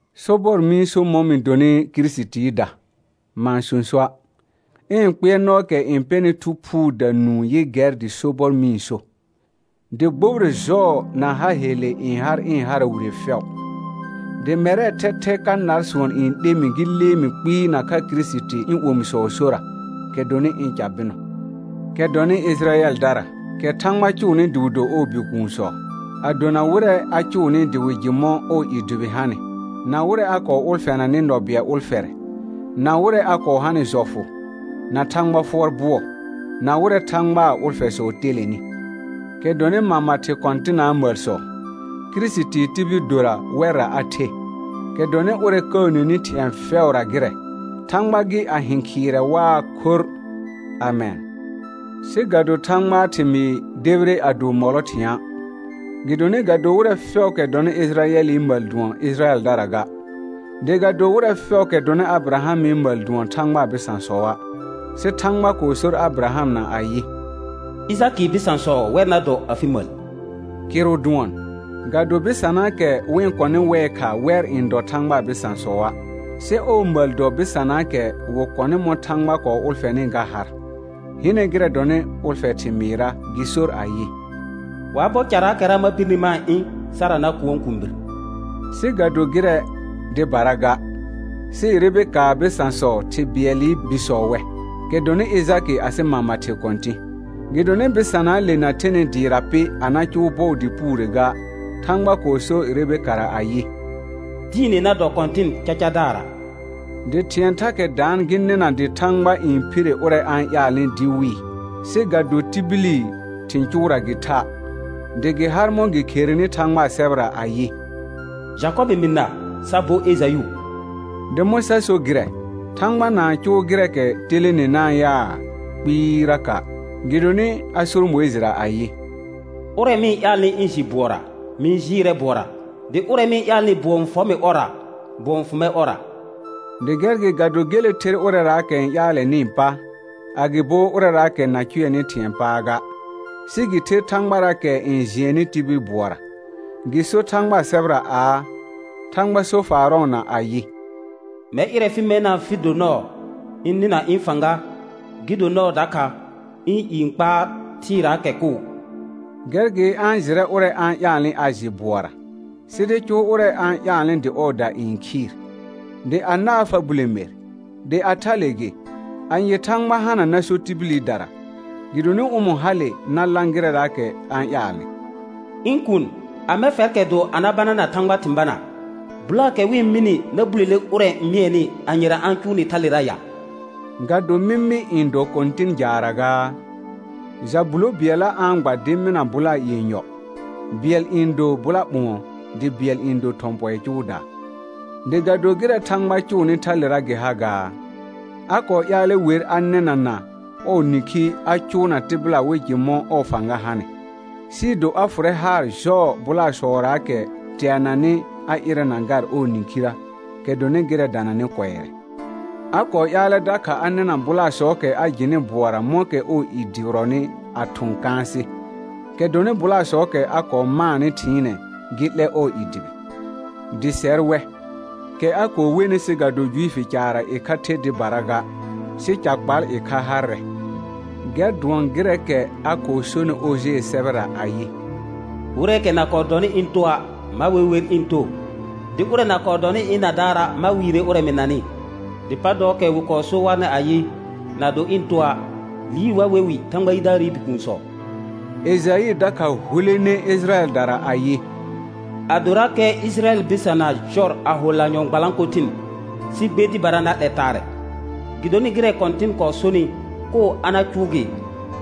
Sobɔr mɩ-n so mɔ̃ mɩ donɩ Kirisitiida, ma-n sõsoa'. Ɩ̃ kpɩɛrnɔɔkɛ n pɛnɩ Thu Phuuda nũu yɩ gɛr dɩ sobɔr mɩ-n so, dɩ gbobire jɔɔ na ha helle n har ɩ̃ hara wire fɛʋ. Dɩ mɛrɛɛ thɛthɛ ka nar sʋɔn n 'le mɩ gɩ lee mɩ kpɩɩ nakha Kirisiti ɩ̃ omisɔɔ sora, kɛ dɔnɩ ɩ̃ ca bɩnɔ, kɛ dɔnɩ Ɩjɩrayɛldara, kɛ Thãgba cʋʋnɩ dɩ wɩ do ɔɔ bikuunsɔ, a dona wɩrɛ a cʋʋnɩ dɩ wɩ jɩ mɔ̃ ɔɔ i dʋbɩ hanɩ, na wɩrɛ a kɔɔ ʋlfɛnanɩ nɔ bɩɛl ʋlfɛrɛ, na wɩrɛ a kɔɔ hanɩ jɔfʋ, na Thãgba fʋɔr bʋɔ, na wɩrɛ Thãgbaa ʋlfɛsɔ telenɩ, kɛ dɔnɩ mama thɩ kɔ̃tɩnaa məlsɔ. Kirisitii tibil dora wɛrra a the, kɛ dɔnɩ ʋrɛ kəəneni thɩ̃ɛ fɛʋra gɩrɛ, Thãgba gɩ a hɩ̃ khɩɩrɛ waa khorr. Amɛn. Sɩ ga do Thãgbaa thɩmɩɩ debire a do mɔlɔ thɩ̃a', gɩdonɩ ga do wɩrɛ fɛʋʋkɛ dɔnɩ Ɩjɩrayɛlɩ məl dʋɔn Ɩjɩrayɛldara ga. Dɩ ga do wɩrɛ fɛʋʋkɛ dɔnɩ Abɩrahamɩ məl dʋɔn Thãgbaa bɩsãsɔa'. Sɩ Thãgba kɔɔ sor Abɩrahamna ayɩ: «Ɩjakɩɩ bɩsãsɔ wɛr na dɔ afɩ məl.» Kɩrʋ dʋɔn, ga do bɩsanaakɛ wɩ-n kɔnɩ wɛɛ kha wɛr n dɔ Thãgbaa bɩsãsɔa'; sɩ ɔɔ məl dɔ bɩsanaakɛ wɩ kɔnɩ mɔ̃ Thãgba kɔɔ ʋlfɛnɩ ga har. Hɩnɛ gɩrɛ dɔnɩ ʋlfɛ thɩmɩɩrra gɩ sor ayɩ: «Wa bɔ caraakɛra ma birni ma-n ɩ̃ Sara na kʋɔn kũubir.» Sɩ ga do gɩrɛ dɩbara ga, sɩ Rebekaa bɩsãsɔ thɩ bɩɛlɩ bisɔ wɛ, kɛ dɔnɩ Ɩjakɩ asɩ mama thɩ kɔ̃tɩ̃. Gɩdonɩ bɩsanaale na thenɩ dɩɩra pɩ a na eʋʋ bɔɔ dɩ puure ga, Thãgba kɔɔ sor Rebekara ayɩ: «Diine na dɔ kɔ̃tɩn cacadaarra.» Dɩ thɩ̃ɛ thakɛ daan gɩ nɩna dɩ Thãgba n phire ʋrɛ a-n ƴaalnɩ dɩ wɩɩ, sɩ ga do tibili thɩ̃ cʋʋra gɩ tha'. Dɩ gɩ har mɔ̃ gɩ kherenɩ Thãgbaa sɛbɛra ayɩ: «Jakɔbɩ mɩ na sa bo Ejayʋ.» Dɩ mɔ̃ sa so gɩrɛ? Thãgba na-n cʋʋ gɩrɛɛkɛ telenenaa yaa? Kpɩɩraka'. Gɩdonɩ a sor Mʋɩjɩra ayɩ: «Ʋrɛ mɩ-n ƴaalnɩ ɩ̃ jɩ bʋɔra, mɩ-n jɩɩrɛ bʋɔra, dɩ ʋrɛ mɩ-n ƴaalnɩ bʋɔ n fɔ mɩ ɔrra, bʋɔ n fʋ mɛr ɔrra.» Dɩ gɛr gɩ ga do gele ther ʋrɛraakɛ n ƴaalɛnɩɩ pa, agɩbo ʋrɛraakɛ na cʋɛnɩ thɩ̃ɛɛ pa ga, sɩ gɩ ther Thãgbaraakɛ n jɩɛnnɩ tibil bʋɔra. Gɩ sor Thãgbaa sɛbɛra aa, Thãgba sor Eaarɔna ayɩ: «Mɛr ɩrɛ fɩ mɛna fɩ do nɔɔ ɩ̃ nɩna ɩ̃ fãga, gɩ do nɔɔ dakha ɩ̃ i n kpaar thɩɩraakɛ koo.» Gɛr gɩ a-n jɩrɛ ʋrɛ a-n ƴaalnɩ a jɩ bʋɔra, sɩ dɩ cʋʋ ʋrɛ a-n ƴaalnɩ dɩ ɔɔda n khɩɩr. Dɩ anaa fa bule mer: Dɩ a thale gɩ, anye Thãgba hana na so tibilidara, gɩdonɩ ʋmɔ̃ hale na lã gɩrɛraakɛ a-n ƴaalnɩ? Ɩ̃ kuun, amɛ fɛrkɛ do a na banana Thãgba thɩ̃ banaa? Bʋlaakɛ wɩ-n mɩnɩ na bulele ʋrɛ n mɩɛnɩ, anyera a-n cʋʋ nɩ thalera ya? Ga do mɩmɩ n dɔ kɔ̃tɩn jaarra gaa? Ja bulo bɩɛlla a-n gba dɩ mɩna bʋlaa yenyɔ, bɩɛl n do bʋla ɓʋ̃ɔ, dɩ bɩɛl n do thɔ̃ pɔɩ cʋʋdaa. Dɩ ga do gɩrɛ Thãgba cʋʋnɩ thalera gɩ ha gaa? A kɔɔ ƴaalɛ wer a nɩnana ɔɔ nĩkhi a cʋʋna tɩbɩla wɩ jɩ mɔ̃ ɔɔ fãga hanɩ, sɩɩ do a fʋrɛ haar jɔɔ bʋlaasɔraakɛ teananɩ a ɩrɛna gar ɔɔ nĩkhirə, kɛ dɔnɩ gɩrɛ dananɩ kʋɛrɛ. A kɔɔ ƴaalɛ dakha a nɩna bʋlaasɔɔkɛ a jɩnɩ bʋɔra mɔ̃kɛ ɔɔ i dʋbɩrɔnɩ a thʋ̃ kãasɩ, kɛ dɔnɩ bʋlaasɔɔkɛ a kɔɔ maanɩ thɩɩnɛ gɩ 'lɛ ɔɔ i dʋbɩ; dɩ sɛr wɛ, kɛ a kɔɔ wenɩ sɩ ga do Juifi caarra ɩkha the dɩbara ga, sɩ ca kpal ɩkha harrɛ. Gɛr dʋɔn gɩrɛɛkɛ a kɔɔ sonɩ Ojee sɛbɛra ayɩ: «Wɩrɛɛkɛ na kɔɔ dɔnɩ ɩ̃ toa', ma we wer ɩ̃ too. Dɩ ʋrɛ na kɔɔ dɔnɩ ɩ̃ nadaara', ma wɩɩrɛ ʋrɛ mɩ nanɩ. Dɩ pa dɔɔkɛ wɩ kɔɔ so warnɩ ayɩ: Na do ɩ̃ toa', liir wa we wɩ Thãgba yidaarɩ bikuunsɔ.» Ejaɩ dakha hulene Ɩjɩrayɛldara ayɩ: «Adorakɛ Ɩjɩrayɛl bɩsana jɔr a ho lanyɔ̃ gbalãkothɩn, sɩ gbe dɩbara na 'lɛ taarɛ; gɩdonɩ gɩrɛ Kɔ̃tɩn kɔɔ sonɩ, koo a na cʋʋ gɩ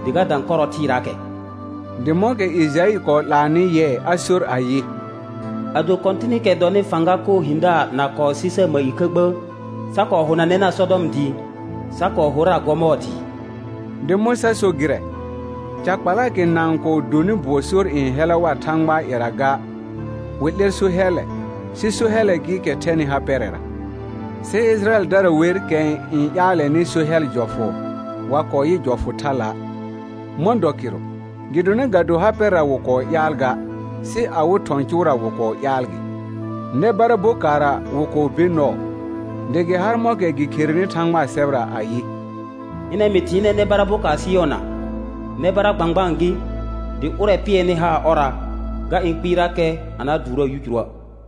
dɩ ga dã kɔrɔ thɩɩraakɛ.» Dɩ mɔ̃kɛ Ejaɩ kɔɔ 'laanɩ yɩɛ a sor ayɩ: «Ado Kɔ̃tɩnɩkɛ dɔnɩ fãga koo hɩ̃daar na kɔɔ sɩ sar məl ɩkha gbə', sa kɔɔ honanɛna Sɔdɔm dɩɩ, sa kɔɔ horra Gɔmɔɔr dɩɩ.» Dɩ mɔ̃ sa so gɩrɛ? Ca kpalaakɛ na-n kɔɔ dɔnɩ bʋɔ sor n hɛla war Thãgbaa ƴɛra ga, wɩ 'lɛr so hɛllɛ, sɩ so hɛllɛ gɩɩkɛ thɛnɩ ha pɛrɛra; sɩ Ɩjɩrayɛldara wer kɛ n ƴaalɛnɩ so hɛl jɔfʋ, wa kɔɔ yɩ jɔfʋ thala'. Mɔ̃ dɔ kɩrʋ? Gɩdonɩ ga do ha pɛrɛra wɩ kɔɔ ƴaal ga, sɩ awɩ thɔ̃ cʋʋra wɩ kɔɔ ƴaal gɩ. Nɛ bara bokaarra wɩ kɔɔ be nɔɔ, dɩ gɩ har mɔ̃kɛra gɩ kherenɩ Thãgbaa sɛbɛra ayɩ: «Hɩnɛ mɩ thɩɩnɛ nɛ bara bokaar Sɩyɔna, nɛ bara gbãgbaan gɩ, dɩ ʋrɛ pɩɛrnɩ haar ɔrra, ga ɩ̃ kpɩɩrakɛ a na dʋʋraa yicuruə'.»